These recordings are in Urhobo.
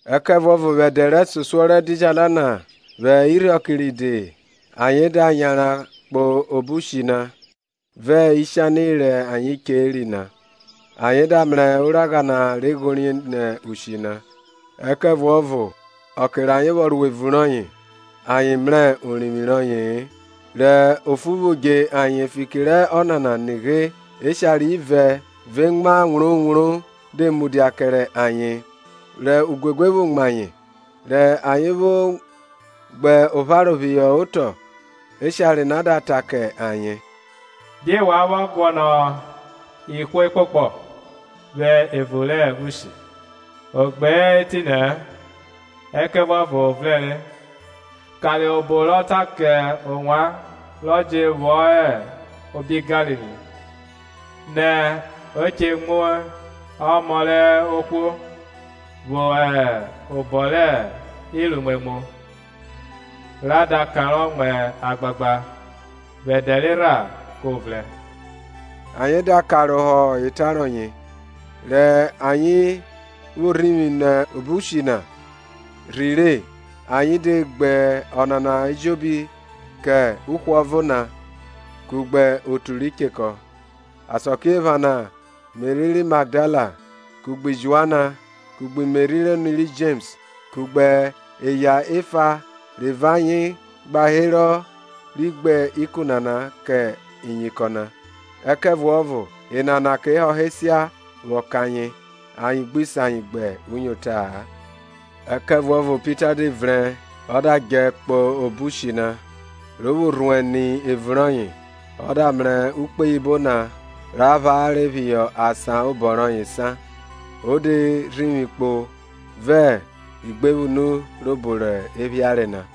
Ẹkẹvuọvo vwẹ ẹdẹ rẹsosuọ rẹ ẹdidjala na, vwẹ irhiọke ride ayen da yanran kpo obo ushi na, vẹ ishani rẹ ayen cheri na. Ayen da mrẹ oragha na re ghorie nẹ ushi na, ẹkẹvuọvo ọke rẹ ayen vwọ ro evun rọye ayen mrẹ orivwi rọye-e. Rẹ ofu vwo dje ayen fiki rẹ Ọnana, nighe, eshare ivẹ vẹ emwa wrowro de mudia kẹrẹ ayen; rẹ uguegue vwo mu ayen rẹ ayen vwo gbe opharo phihọ otọ, eshare na da ta kẹ ayen, Die wa vwọ guọnọ ihwo ekpokpọ vwẹ evun rẹ ushi? Ọ gbe hẹ etinẹ-ẹ, ẹkẹvuọvo o vrẹnre. karohọ obo rọ ta kẹ ovwan rọ je vwọ hẹ obi Galili, nẹ e che mu Ọmọ rẹ ohwo vwọ hẹ obọ rẹ iruimwemwu, ra da kanrọ mu agbagba, vwẹ ẹdẹ rerha ko vrẹn. Ayen da karohọ eta rọye, rẹ ayen vwo rhivwi nẹ obo ushi na rhire ayen de gbe ọnana ejobi kẹ uhwọvo na kugbe otu ri chekọ. Asakiephana Meri ri Magdala kugbe Joana kugbe Meri rẹ oni ri Jems kugbe eya efa re vẹ ayen gba herọ ri gbe ikun nana kẹ iyinkọn na; ẹkẹvuọvo enana ke họhọ esia vwọ kẹ ayen, ayen gbi se ayen gbuyota-a. Ẹkẹvuọvo Pita de vrẹn ọ da djẹ kpo obo ushi na; ro vwo rhuẹn ni evun rọye, ọ da mrẹ ukpoyibo na ra phare phihọ asan obọ rọye sa, o de rhivwi kpo vẹ igbevwunu rẹ obo re phiare na.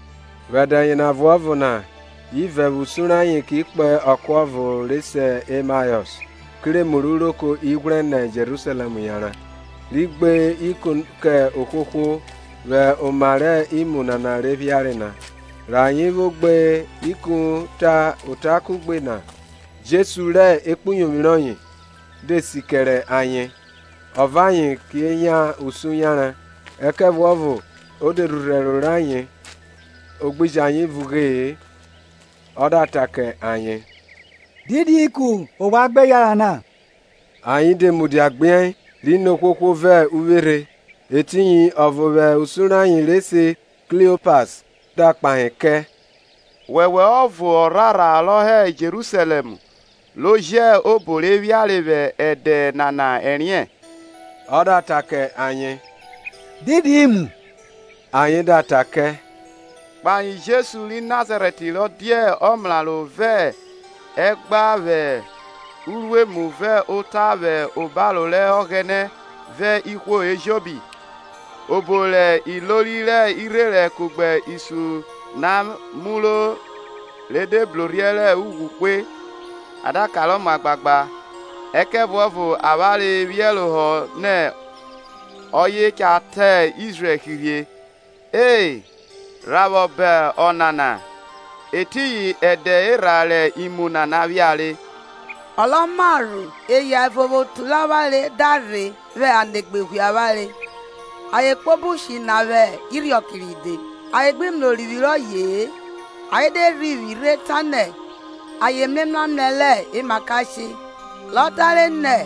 Vwẹ ẹdẹ yena ọvuọvo na ivẹ vwẹ usun rẹ ayen ki kpo ọko ọvo re se Emaọs, kerẹ emu rẹ uroko ighwrẹ nẹ Jerusalẹm yanran, ri gbe ikun kẹ ohwohwo vwẹ oma rẹ imu nana re phiare na. Rẹ ayen vwo gbe ikun ta ota kuẹgbe na, Jesu vẹ ekpuyovwi rọye de si kẹrẹ ayen ọ vẹ ayen ke yan usun yanran. Ẹkẹvuọvo e de rhurhu ẹro rayen o gbi jẹ ayen vugbe-e. Ọ da ta kẹ ayen, Didi ikun ovwan gbe yanran na? Ayen de mudia gbiẹi, ri ni ohwohwo vẹ uvweri. Etiyin ọvo vwẹ usun rẹ ayen, re se Kliopas, da kpahe kẹ, Wọwẹ ọvo ọrhorha rọ hẹ Jerusalẹm ro jẹ obo re phiare vwẹ ẹdẹ nana ẹriẹn? Ọ da ta kẹ ayen, Didi imu? Ayen da ta kẹ, Kpahe Jesu ri Nazarẹt ro dia ọmraro vẹ ẹgba vwẹ uruemu vẹ ota vwẹ obaro rẹ Ọghẹnẹ vẹ ihwo ejobi, obo rẹ ilori rẹ irherẹn kugbe isun na muro re de brorhiẹ rẹ ughwu hwe, a da kanrọ mu agbagba. Ẹkẹvuọvo avwanre phiẹrohọ nẹ ọye cha tan Izrẹl hirhe. E, rha vwọ ba Ọnana, etiyin ẹdẹ erha rẹ imu nana phiare. Ọ rọ marho, eya ẹvo vwẹ otu rẹ avwanre da rhe vwẹ anegbe ghwiẹ avwanre. Ayen kpo obo ushi na vwẹ irhiọke ride, ayen gbe mrẹ orivwi rọye-e; ayen de rhivwi rhe tanẹ ayen mrẹ emramrẹ rẹ emakashe, rọ tare nẹ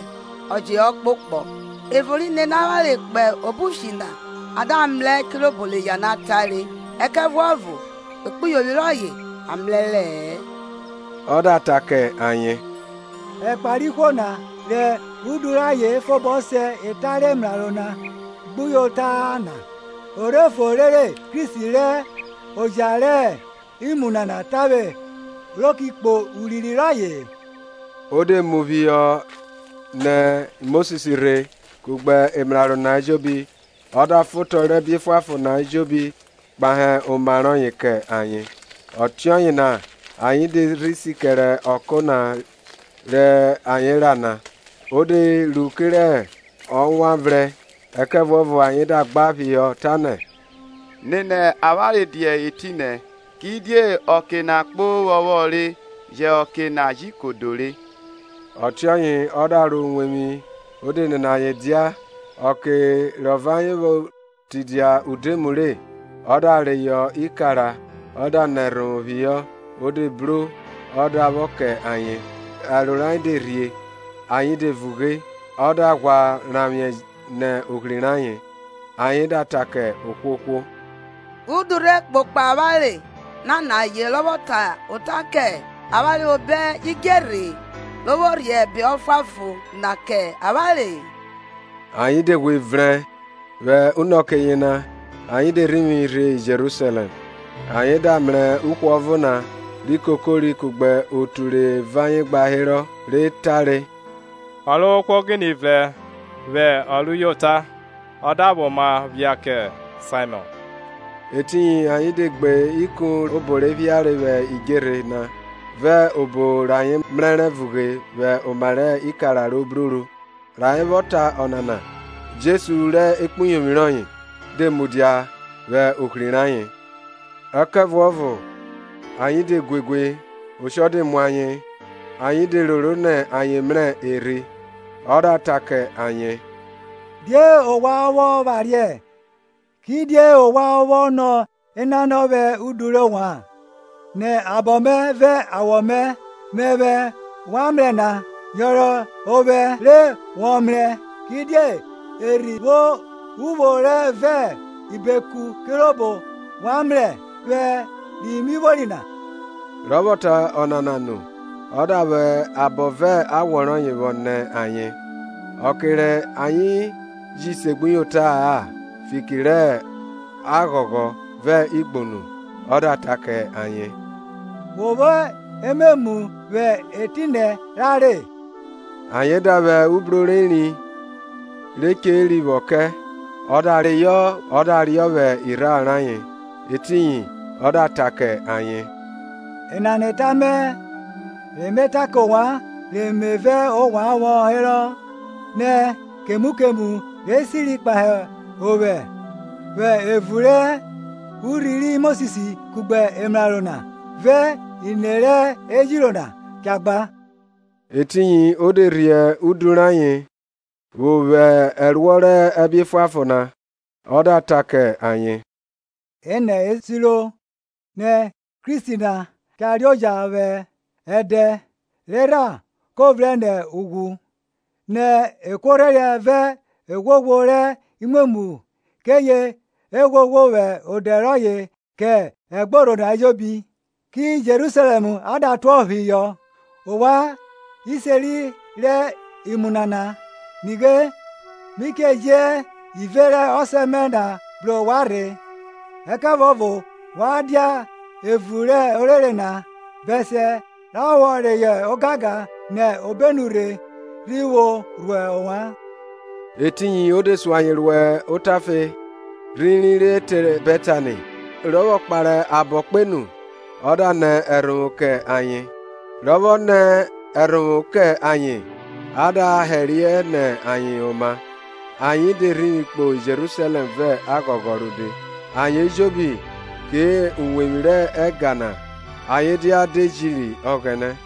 ọ je hẹ ọkpokpọ. Ẹvo ri nene avwanre kpo obo ushi na, a da mrẹ kirobo rẹ eya na tare; ẹkẹvuọvo ekpuyovwi rọye a mrẹrẹ-ẹ. Ọ da ta kẹ ayen, Ẹkpa rẹ ihwo na, rẹ udu rẹ ayen fobọ se eta rẹ emraro na gbuyota-a na! O rhe fo rere Kristi re oja rẹ imu nana tavwe ro ki kpo urinrin rọye-e? O de mu phihọ nẹ Mosis rhe kugbe emraro na ejobi, ọ da fan otọ rẹ ẹbe efuanfon na ejobi kpahe oma rọye kẹ ayen. Ọtiọye na ayen de rhi si kẹre ọko na rẹ ayen ra na. O de ru kerẹ ọ wan vrẹn, ẹkẹvuọvo ayen da gba phihọ, tanẹ, Nene avwanre dia etinẹ, kidie ọke na kpo ovwọnvwọn re yẹ ọke na ji kodo re. Ọtiọye ọ da ro uwevwi o de nene ayen dia. Ọke rọ vẹ ayen vwo tidia udoemu re, ọ da reyọ ikara ọ da nẹ ẹrhovwo phihọ, o de bro, ọ da vwọ kẹ ayen. Ẹro rayen de rhie ayen de vughe; ọ da ghwa ranvwiẹ nẹ ohri rayen. Ayen da ta kẹ ohwohwo, udu rhe kpokpo avwanre nanaye rọ vwọ ta ota kẹ avwanre vwẹ obo idjerhe-e, ro vwo rhie ẹbe efuanfon na kẹ avwanre? Ayen de ghwe vrẹn vwẹ unọke yena ayen de rhivwi rhe Jerusalẹm; ayen da mrẹ uhwọvo na ri kokori kugbe otu re vẹ ayen gba herọ, re tare, Ọrovwohwo ghine vrẹn vwẹ ọ rẹ uyota, ọ da vwẹ oma phia kẹ Saimọn! Etiyin ayen de gbe ikun rẹ obo re phia vwẹ idjerhe na, vẹ obo rẹ ayen mrẹrẹ vughe vwẹ oma rẹ ikara ro bruru. Rẹ ayen vwọ ta ọnana, Jesu vẹ ekpuyovwi rọye de mudia vwẹ ohri rẹ ayen. Ẹkẹvuọvo ayen de guegue oshọ de mu ayen, ayen de roro nẹ ayen mrẹ erhi. Ọ da ta kẹ ayen, Die ovwan vwọ phariẹ, kidie ovwan vwọ nọ enanọ vwẹ udu rẹ ovwan? Ni abọ mẹ vẹ awọ mẹ, mẹvwẹ wa mrẹ na; yọnrọn ovwẹ, re wọ mrẹ; kidie erhi vwo uvwo vẹ ibeku kirobo wa mrẹ vwẹ ri mi vwori na. Rọ vwọ ta ọnana nu, ọ da vwẹ abọ vẹ awọ rọye vwọ nẹ ayen. Ọke rẹ ayen ji segbuyota-a fiki rẹ aghọghọ, vẹ igbunu, ọ da ta ke ayen, We vwo ememu vwẹ etinẹ ra re? Ayen da vwẹ ubro rẹ eri re cheri vwọ kẹ, Ọ da reyọ ọ da riọ vwẹ irharo rẹ ayen. Etiyin ọ da ta kẹ ayen, Enana eta mẹ re me ta kẹ ovwan, re me vẹ ovwan vwọ herọ, nẹ kemu kemu re siri kpahe ovwẹ vwẹ evun re urhi ri Mosis kugbe emraro na vẹ ine rẹ ejiro na cha gba. Etiyin o de rhie udu rayen vwo vwo ẹruọ rẹ ẹbe efuanfon na, ọ da ra kẹ ayen, Enẹ e siro, nẹ Kristi na cha reoja vwẹ ẹdẹ rerha ko vrẹn nẹ ughwu, nẹ ekuorhẹriẹ vẹ evwoghovwo rẹ imwemwu keye e ghwoghwo vwẹ odẹ rọye kẹ ẹgborho na ejobi, ki Jerusalẹm a da tuọphihọ. Ovwan iseri rẹ imu nana. Nighe, mi che ji ive rẹ Ọsẹ mẹ na bru ovwan rhe; ẹkẹvuọvo wa dia evun rẹ orere na, bẹsiẹ ra vwọ reyọ ogangan nẹ obenu rhe rhi vwo rhuo ovwan. Etiyin ọ de sun ayen ro otafe rhiri re te Bẹtani, rọ vwọ kpare abọ kpenu ọ da nẹ ẹrhovwo kẹ ayen. Rọ vwọ nẹ ẹrhovwo kẹ ayen, a da hẹriẹ nẹ ayen oma. Ayen de rhivwi rhe Jerusalẹm vẹ aghọghọ rode, ayen ejobi kẹ uwevwi rẹ ẹga na ayen dia de jiri Ọghẹnẹ.